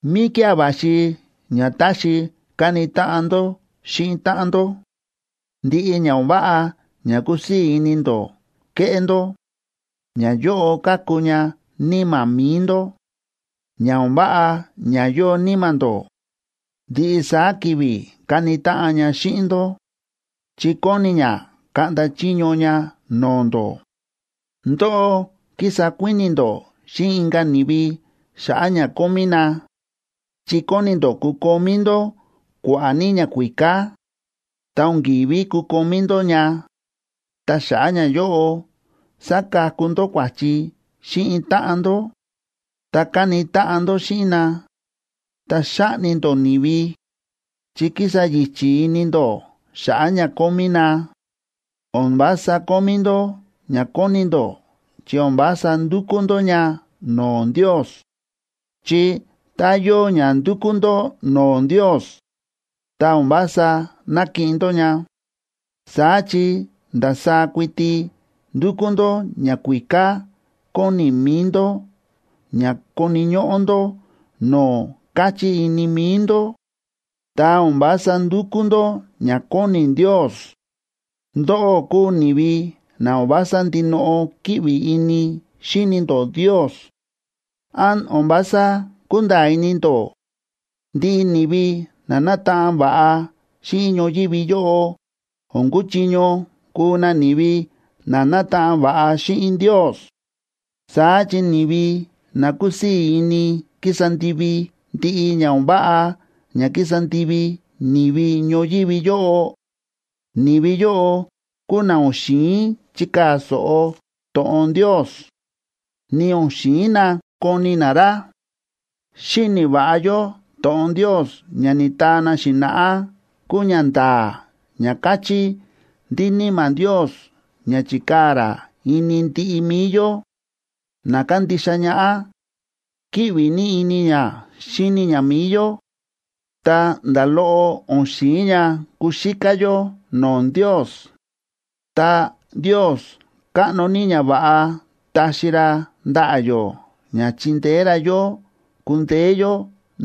¿Míkía̱ va̱xi ña táxi kani táꞌan ndó xíꞌin táꞌan ndó? Ndiꞌi ña o̱n váꞌa ña kúsii̱ ini ndó keꞌé ndó, ñayóꞌo káku ña níma̱ mi̱i ndó. Ña o̱n váꞌa ña yóo níma̱ ndó, ndiꞌi saá ki̱vi̱ káni táꞌan ña xíꞌin ndó, chi kóni ña kaꞌnda chiño ña no̱o̱ ndó. Ndóꞌó kísa kuíni̱ ndó xíꞌin inka̱ ni̱vi xa̱ꞌa̱ ña kómí na, chi kóni ndó kukomí ndó kua̱ꞌa̱ ní ñakuíká. Ta o̱n ki̱ví kukomí ndó ña, ta xa̱ꞌa̱ ñayóꞌo sákaku ndó kua̱chi xíꞌin táꞌan ndó, ta káni táꞌan ndó xíꞌin na, ta xáꞌni ndó ni̱vi, chi kísa yi̱chi̱ ini ndó xa̱ꞌa̱ ña kómí na. O̱n vása kómí ndó ña kóni ndó chi o̱n vása ndukú ndó ña no̱o̱ Ndios. Chi tá yóo ña ndúkú ndó no̱o̱ Ndios, ta o̱n vása nákiꞌin ndó ña, saá chi ndasaá kuiti ndúkú ndó ñakuíká kóni mi̱i ndó ña koni̱ ñóꞌó ndó no̱o̱ káchí ini mi̱i ndó, ta o̱n vása ndúkú ndó ña kóni Ndios. ¡Ndóꞌó kúu ni̱vi na o̱n vása ndinoꞌo kíꞌvi ini xíni ndó Ndios! ¿Án o̱n vása kúnda̱a̱ ini ndó, ndiꞌi ni̱vi na nátaꞌan va̱ꞌa xíꞌin ñoyívi yóꞌo o̱n kúchiño kuu na ni̱vi na nátaꞌan va̱ꞌa xíꞌin Ndios? Saá chi ni̱vi na kúsii̱ ini kísa ndivi ndiꞌi ña o̱n váꞌa ña kísa ndivi ni̱vi ñoyívi yóꞌo, ni̱vi yóꞌo kúu na o̱n xi̱in chikaa̱ so̱ꞌo to̱ꞌon Ndios, ni o̱n xi̱in na koni na ra. Xíni̱ va̱ꞌa yó to̱ꞌon Ndios ña ni̱taa na xi̱na̱ꞌá kúu ñanda̱a̱ ña káchí ndí Níma̱ Ndios ña chi̱kaa̱ ra ini ndiꞌi mi̱i yó na kándixa ñaꞌá, kíꞌvi ní ini ña xíni ña mi̱i yó, ta nda̱ loꞌo o̱n xi̱in ña kuxíká yó no̱o̱ Ndios. Ta Ndios káꞌno ní ñava̱ꞌa taxi ra ndaꞌa̱ yó ña chindeé ra yó kundeé yó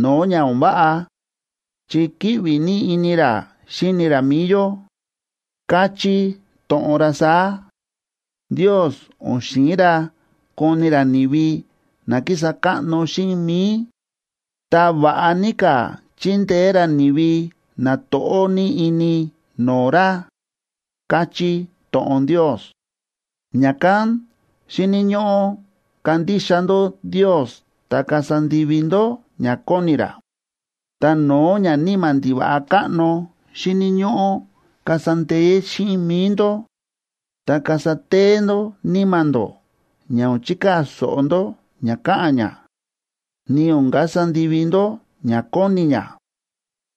no̱o̱ ña o̱n váꞌa, chi kíꞌvi ní ini ra xíni ra mi̱i yó. Káchí to̱ꞌon ra saá: “Ndios o̱n xi̱in ra koni ra ni̱vi na kísa káꞌno xíꞌin mi̱i; ta va̱ꞌa ní ka̱ chíndeé ra ni̱vi na to̱ꞌó ní ini no̱o̱ ra”, káchí to̱ꞌon Ndios. Ña̱kán xíni̱ ñóꞌó kandixa ndó Ndios ta kasa ndivi ndó ña kóni ra. Ta no̱o̱ ñaníma̱ ndiva̱ꞌa káꞌno xíni̱ ñóꞌó kasa ndee̱ xíꞌin mi̱i ndó, ta kasa téé ndó níma̱ ndó ña o̱n chikaa̱ so̱ꞌo ndó ña káꞌa̱n ña, ni o̱n kasa ndivi ndó ña kóni ña,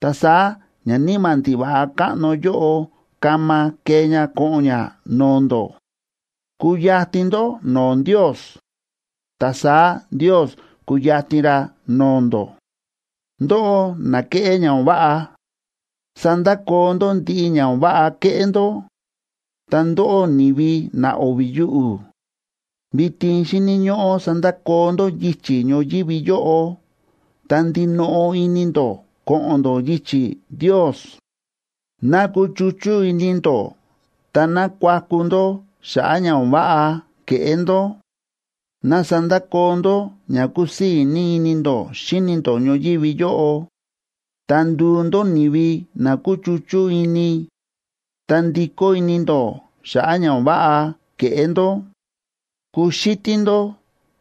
ta saá ñaníma̱ ndiva̱ꞌa káꞌno yóꞌo kama kee ña ko̱ꞌo̱n ña no̱o̱ ndó. Kuyatin ndó no̱o̱ Ndios, ta saá Ndios kuyatin ra no̱o̱ ndó. Ndóꞌó na kéꞌé ña o̱n váꞌa, sandakoo ndó ndiꞌi ña o̱n váꞌa kéꞌé ndó. Ta ndóꞌó ni̱vi na o̱vi̱ yuꞌu̱, vitin xíni̱ ñóꞌó sandakoo ndó yichi̱ ñoyívi yóꞌo ta ndinoꞌo ini ndó ko̱ꞌo̱n ndó yichi̱ Ndios. Ná kuchuchú ini ndó ta ná kuaku ndó xa̱ꞌa̱ ña o̱n váꞌa ke̱ꞌé ndó. Ná sandakoo ndó ña kúsii̱ ní ini ndó xíni̱ ndó ñoyívi yóꞌo, ta nduu ndó ni̱vi na kuchuchú ini, ta ndikó ini ndó xa̱ꞌa̱ ña o̱n váꞌa ke̱ꞌé ndó. Kuxítí ndó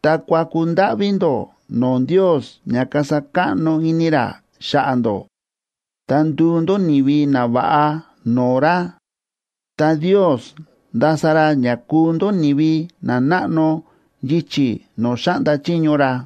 ta kuaku ndáꞌví ndó no̱o̱ Ndios ña kasa káꞌno ini ra xa̱ꞌa̱ ndó, ta nduu ndó ni̱vi nava̱ꞌa no̱o̱ ra, ta Ndios ndasa ra ña kuu ndó ni̱vi nanáꞌno yichi̱ no̱o̱ xáꞌnda chiño ra.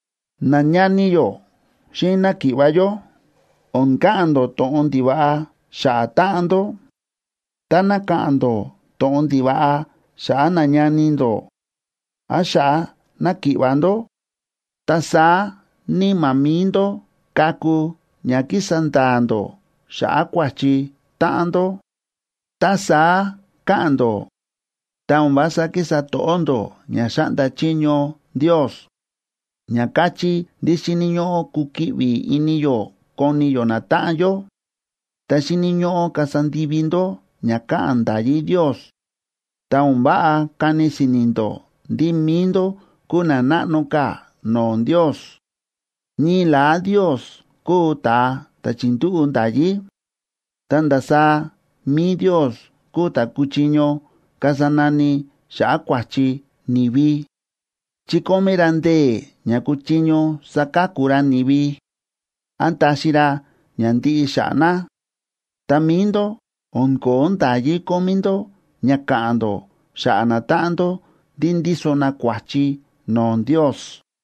Nañani yó xíꞌin náki̱ꞌva̱ yó, o̱n ka̱ꞌa̱n ndó to̱ꞌon ndiva̱ꞌa xa̱ꞌa̱ táꞌan ndó. Táná ka̱ꞌa̱n ndó to̱ꞌon ndiva̱ꞌa xa̱ꞌa̱ nañani ndó án xa̱ꞌa̱ náki̱ꞌva̱ ndó, ta saá níma̱ mi̱i ndó káku ña kísa nda̱a̱ ndó xa̱ꞌa̱ kua̱chi táꞌan ndó. Tá saá káꞌa̱n ndó, ta o̱n vása kísa to̱ꞌó ndó ña xáꞌnda chiño Ndios, ña káchí ndí xíni̱ ñóꞌó kukiꞌvi ini yó koni yó natáꞌan yó. Ta xíni̱ ñóꞌó kasa ndivi ndó ña káꞌa̱n nda̱yí Ndios, ta o̱n váꞌa kani si̱ni̱ ndó ndí mi̱i ndó kúu na náꞌno ka̱ no̱o̱ Ndios. Ñii la̱á Ndios kúu ta̱a ta̱ chi̱ndúꞌu̱ nda̱yí, ta ndasaá mi̱i Ndios kúu ta̱ kúchiño kasa nani xa̱ꞌa̱ kua̱chi ni̱vi, chi kómí ra ndee̱ ña kúchiño saka̱ku ra ni̱vi án taxi ra ña ndiꞌi xa̱ꞌa̱ na. Ta mi̱i ndó, o̱n ko̱ó nda̱yí kómí ndó ña ka̱ꞌa̱n ndó xa̱ꞌa̱ natáꞌan ndó ndí ndíso na kua̱chi no̱o̱ Ndios.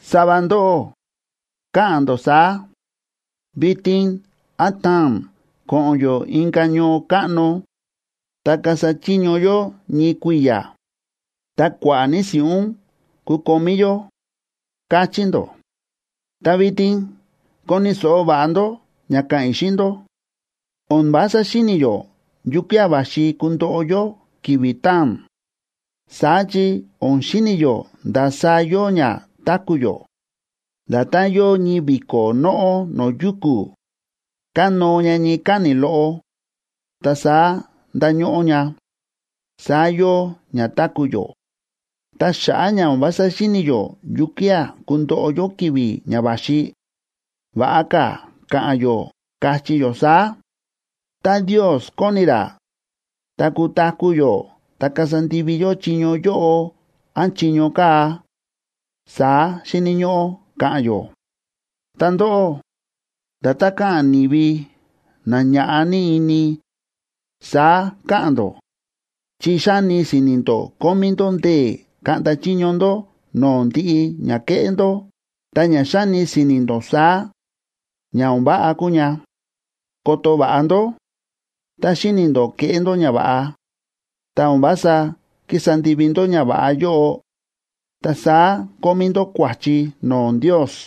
Sava ndóꞌó káꞌa̱n ndó saá: “Vitin án taa̱n ko̱ꞌo̱n yó inka̱ ñoo káꞌno, ta kasa chiño yó ñii kui̱ya̱, ta kua̱ꞌa̱ ní si̱ꞌún kukomí yó”, káchí ndó. Ta vitin koni̱ so̱ꞌo va̱ꞌa ndó ña ka̱ꞌa̱n i̱ xíꞌin ndó. O̱n vása xíni̱ yó yukía̱ va̱xi kundoꞌo yó ki̱vi̱ taa̱n. Saá chi o̱n xíni̱ yó ndasaá yóo ña táku̱ yó. Nda̱tán yóo ñii vi̱ko̱ nóꞌó no̱o̱ yuku̱, kánóo ña ñii káni̱ loꞌo ta saá ndáñóꞌó ña, saá yóo ña táku̱ yó. Ta xa̱ꞌa̱ ña o̱n vása xíni̱ yó yukía̱ kundoꞌo yó ki̱vi̱ ña va̱xi, va̱ꞌa ka̱ ka̱ꞌa̱n yó, kachí yó saá: “Tá Ndios kóni ra, ta kutaku̱ yó ta kasa ndivi yó chiño yóꞌo án chiño kaa̱”, saá xíni̱ ñóꞌó ka̱ꞌa̱n yó. Ta ndóꞌó, nda̱tán káꞌa̱n ni̱vi na ñáꞌa ní ini, saá káꞌa̱n ndó, chi xáni si̱ni̱ ndó kómí ndó ndee̱ kaꞌnda chiño ndó no̱o̱ ndiꞌi ña keꞌé ndó. Ta ña xáni si̱ni̱ ndó saá, ña o̱n váꞌa kúu ña. Koto va̱ꞌa ndó; tá xíni̱ ndó keꞌé ndó ñava̱ꞌa, ta o̱n vása kísa ndivi ndó ñava̱ꞌa yóꞌo, ta saá kómí ndó kua̱chi no̱o̱ Ndios.